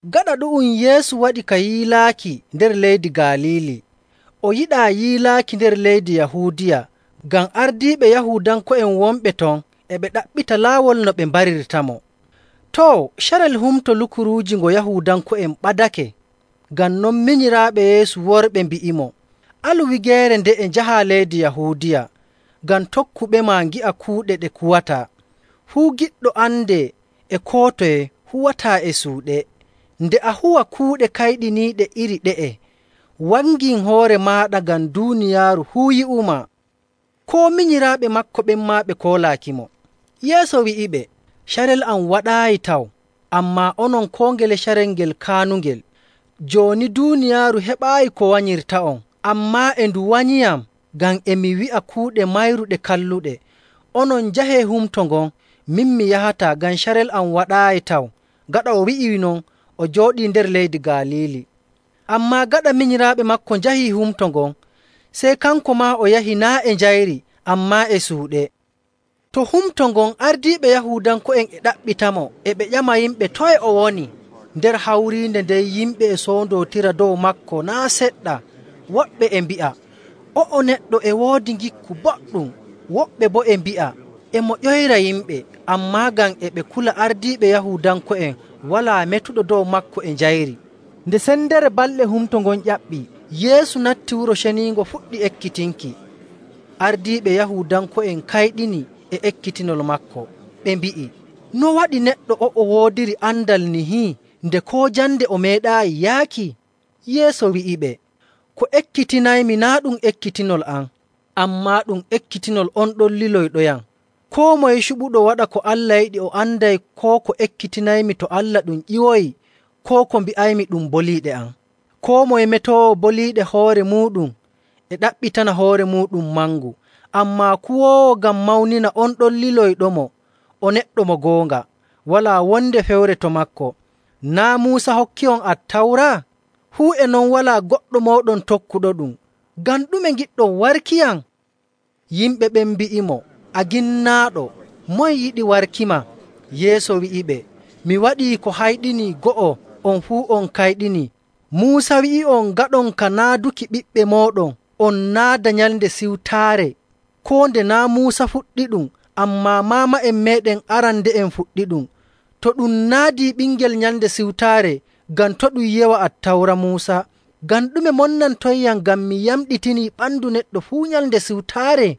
Gaɗa ɗu'um Yeesu waɗi ka yiilaaki nder leydi Galiili. O yiɗaa yiilaaki nder leydi Yahuudiya, ngam ardiiɓe Yahuudanko'en wonɓe ton e ɓe ɗaɓɓita laawol no ɓe mbarirtamo. Too, carel Humto Lukuruuji ngo Yahuudanko'en ɓadake.. Ngam non minyiraaɓe Yeesu worɓe mbi'imo, “Alu wigeere nde'e njahaa leydi Yahuudiya, ngam tokkuɓema ngi'a kuuɗe ɗe kuwataa. Fuu giɗɗo andee e koo toye huwataa e suuɗe. Nde a huwa kuuɗe kayɗiniiɗe iri ɗe'e, wangin hoore maaɗa ngam duuniyaaru fuu yi'umaa.” Koo minyiraaɓe maako ɓen maa ɓe koolaakimo. Yeesu wi'iɓe, “Carel am waɗaayi taw, ammaa onon koo ngele carel ngel kaanungel. Jooni duuniyaaru heɓaayi ko wanyirta'on, ammaa e ndu wanyiiyam ngam e mi wi'a kuuɗe mayru ɗe kalluɗe. Onon njahee humto ngon, min mi yahataa, ngam carel am waɗaayi taw.” Gaɗa o wi'ii non, o jooɗii nder leydi Galiili. Ammaa gaɗa minyiraaɓe maako njahii humto ngon, sey kanko maa o yahi naa' e njayri ammaa e suuɗe. To humto ngon, ardiiɓe Yahuudanko'en e ɗaɓɓitamo, e ɓe ƴama yimɓe, “Toye o woni?” Nder hawriinde nden yimɓe e soondootira dow maako naa' seɗɗa. Woɓɓe e mbi'a, “O'o neɗɗo e woodi ngikku boɗɗum.” Woɓɓe boo e mbi'a, “E mo ƴoyra yimɓe.” Ammaa ngam e ɓe kula ardiiɓe Yahuudanko'en walaa metuɗo dow maako e njayri. Nde sendere balɗe humto ngon ƴaɓɓii, Yeesu natti Wuro Ceniingo fuɗɗi ekkitinki. Ardiiɓe Yahuudanko'en kayɗini e ekkitinol maako, ɓe mbi'i, “No waɗi neɗɗo o'o woodiri andal nihi nde koo jande o meeɗaayi yaaki?” Yeesu wi'iɓe, “Ko ekkitinaymi naa' ɗum ekkitinol am, ammaa ɗum ekkitinol on ɗon liloyɗoyam. Koo moye cuɓuɗo waɗa ko Allah yiɗi o anday koo ko ekkitinaymi to Allah ɗum ƴiwoyi, koo ko mbi'aymi ɗum boliiɗe am. Koo moye metoowo boliiɗe hoore muuɗum e ɗaɓɓitana hoore muuɗum mangu, ammaa kuwoowo ngam mawnina on ɗon liloyɗomo o neɗɗo mo goonga, walaa wonde fewre to maako. Naa' Muusa hokkii'on Attawra? Fuu e non walaa goɗɗo mooɗon tokkuɗoɗum. Ngam ɗume ngiɗɗon warkiyam?” Yimɓe ɓen mbi'imo, “A ginnaaɗo! Moye yiɗi warkima?” Yeesu wi'iɓe, “Mi waɗii ko hayɗinii go'o, on fuu on kayɗinii. Muusa wi'i'on ngaɗon ka naaduki ɓiɓɓe mooɗon, on naada Nyalnde Siwtaare. Koo nde naa' Muusa fuɗɗiɗum, ammaa maama'en meeɗen arande'en fuɗɗiɗum.. To ɗum naadii ɓingel Nyalnde Siwtaare ngam to' ɗum yewa Attawra Muusa, ngam ɗume monnantonyam ngam mi yamɗitinii ɓandu neɗɗo fuu Nyalnde Siwtaare?.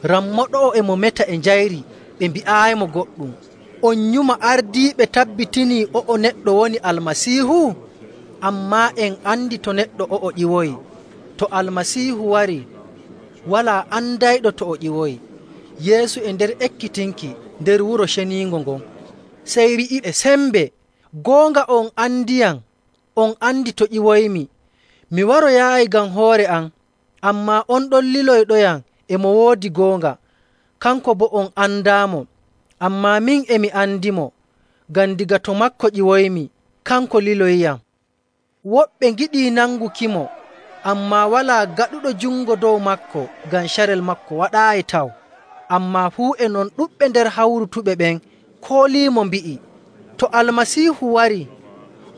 Rammo ɗo'o e mo meta e njayri ɓe mbi'aayimo goɗɗum. On nyuma ardiiɓe tabbitinii o'o neɗɗo woni Almasiihu? Ammaa en andi to neɗɗo o'o ƴiwoyi. To Almasiihu warii, walaa andayɗo to o ƴiwoyi.” Yeesu e nder ekkitinki nder Wuro Ceniingo ngon, sey wi'i e sembe, “Goonga, on andiyam, on andi to ƴiwoymi. Mi waroyaayi ngam hoore am. Ammaa on ɗon liloyɗoyam e mo woodi goonga. Kanko boo on andaamo, ammaa min e mi andimo, ngam daga to maako ƴiwoymi, kanko liloyiyam.” Woɓɓe ngiɗii nangukimo, ammaa walaa gaɗuɗo jungo dow maako, ngam carel maako waɗaayi taw. Ammaa fuu e non ɗuɗɓe nder hawrutuɓe ɓen kooliimo mbi'i, “To Almasiihu warii,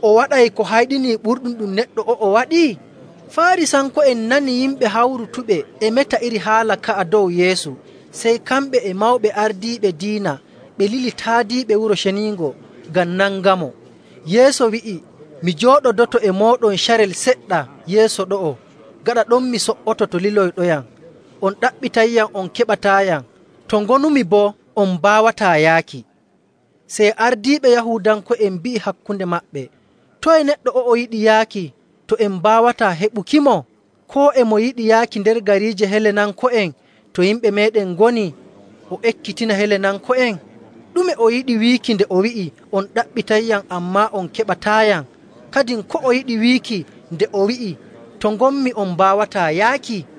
o waɗay ko hayɗini ɓurɗum ɗum neɗɗo o'o waɗi?” Faarisanko'en nani yimɓe hawrutuɓe e meta iri haala ka'a dow Yeesu, sey kamɓe e mawɓe ardiiɓe diina ɓe lili taadiiɓe Wuro Ceniingo ngam nangamo. Yeesu wi'i, “Mi jooɗodoto e mooɗon carel seɗɗa yeeso ɗo'o, gaɗa ɗon mi so''oto to liloyɗoyam. On ɗaɓɓitayyam on keɓataayam, to ngonumi boo on mbaawataa yaaki.” Sey ardiiɓe Yahuudanko'en mbi'i hakkunde maɓɓe, “Toye neɗɗo o'o yiɗi yaaki to en mbaawataa heɓukimo? Koo e mo yiɗi yaaki nder gariije Helenanko'en to yimɓe meeɗen ngoni o ekkitina Helenanko'en? Ɗume o yiɗi wiiki nde o wi'i, ‘On ɗaɓɓitayyam ammaa on keɓataayam.’ Kadin ko o yiɗi wiiki nde o wi'i, ‘To ngonmi on mbaawataa yaaki?’”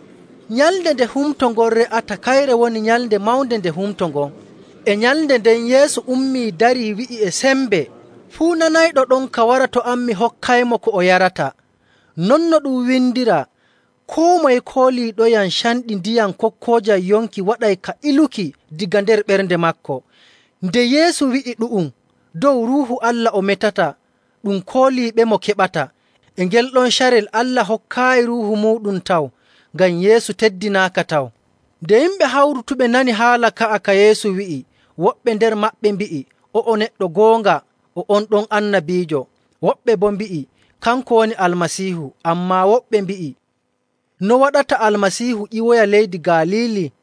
Nyalnde nde humto ngon re'ata, kayre woni nyalnde mawnde nde humto ngon. E nyalnde nden Yeesu ummii, darii, wi'i e sembe, “Fuu nanayɗo ɗonka wara to am mi hokkaymo ko o yarata.. Non no ɗum windiraa, ‘Koo moye kooliiɗoyam, canɗi ndiyam kokkoojam yonki waɗay ka iluki daga nder ɓernde maako.’”. Nde Yeesu wi'i ɗu'um, dow Ruuhu Allah o metata ɗum kooliiɓemo keɓata. E ngel ɗon carel Allah hokkaayi Ruuhu muuɗum taw, ngam Yeesu teddinaaka taw. Nde yimɓe hawrutuɓe nani haala ka'a ka Yeesu wi'i, woɓɓe nder maɓɓe mbi'i, “O'o neɗɗo, goonga, o on ɗon annabiijo.” Woɓɓe boo mbi'i, “Kanko woni Almasiihu.” Ammaa woɓɓe mbi'i, “No waɗata Almasiihu ƴiwoya leydi Galiili?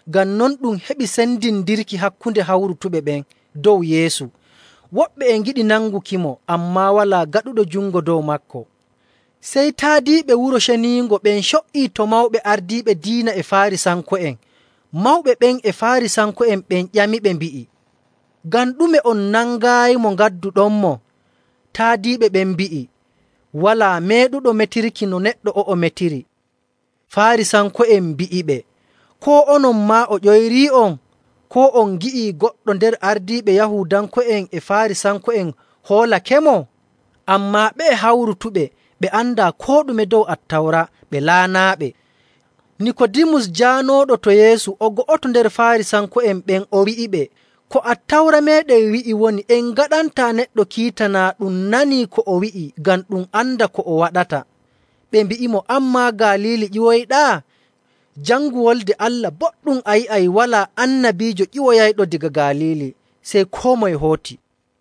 Ngam non ɗum heɓi sendindirki hakkunde hawrutuɓe ɓen dow Yeesu. Woɓɓe e ngiɗi nangukimo, ammaa walaa gaɗuɗo jungo dow maako. Sey taadiiɓe Wuro Ceniingo ɓen co''ii to mawɓe ardiiɓe diina e Faarisanko'en. Mawɓe ɓen e Faarisanko'en ɓen ƴamiɓe, mbi'i, “Ngam ɗume on nangaayimo ngadduɗonmo?” Taadiiɓe ɓen mbi'i, “Walaa meeɗuɗo metirki no neɗɗo o'o metiri.” Faarisanko'en mbi'iɓe, “Koo onon maa o ƴoyrii'on? Koo on ngi'ii goɗɗo nder ardiiɓe Yahuudanko'en e Faarisanko'en hoolakemo? Ammaa ɓe'e hawrutuɓe ɓe andaa koo ɗume dow Attawra, ɓe laanaaɓe.” Nikoodimus jaanooɗo to Yeesu o go'oto nder Faarisanko'en ɓen, o wi'iɓe,. “Ko Attawra meeɗen wi'i woni en ngaɗantaa neɗɗo kiita naa ɗum nanii ko o wi'i ngam ɗum anda ko o waɗata.” Ɓe mbi'imo, “An maa Galiili ƴiwoyɗaa? Jangu Wolde Allah boɗɗum, a yi'ay walaa annabiijo ƴiwoyayɗo daga Galiili.” Sey koo moye hooti.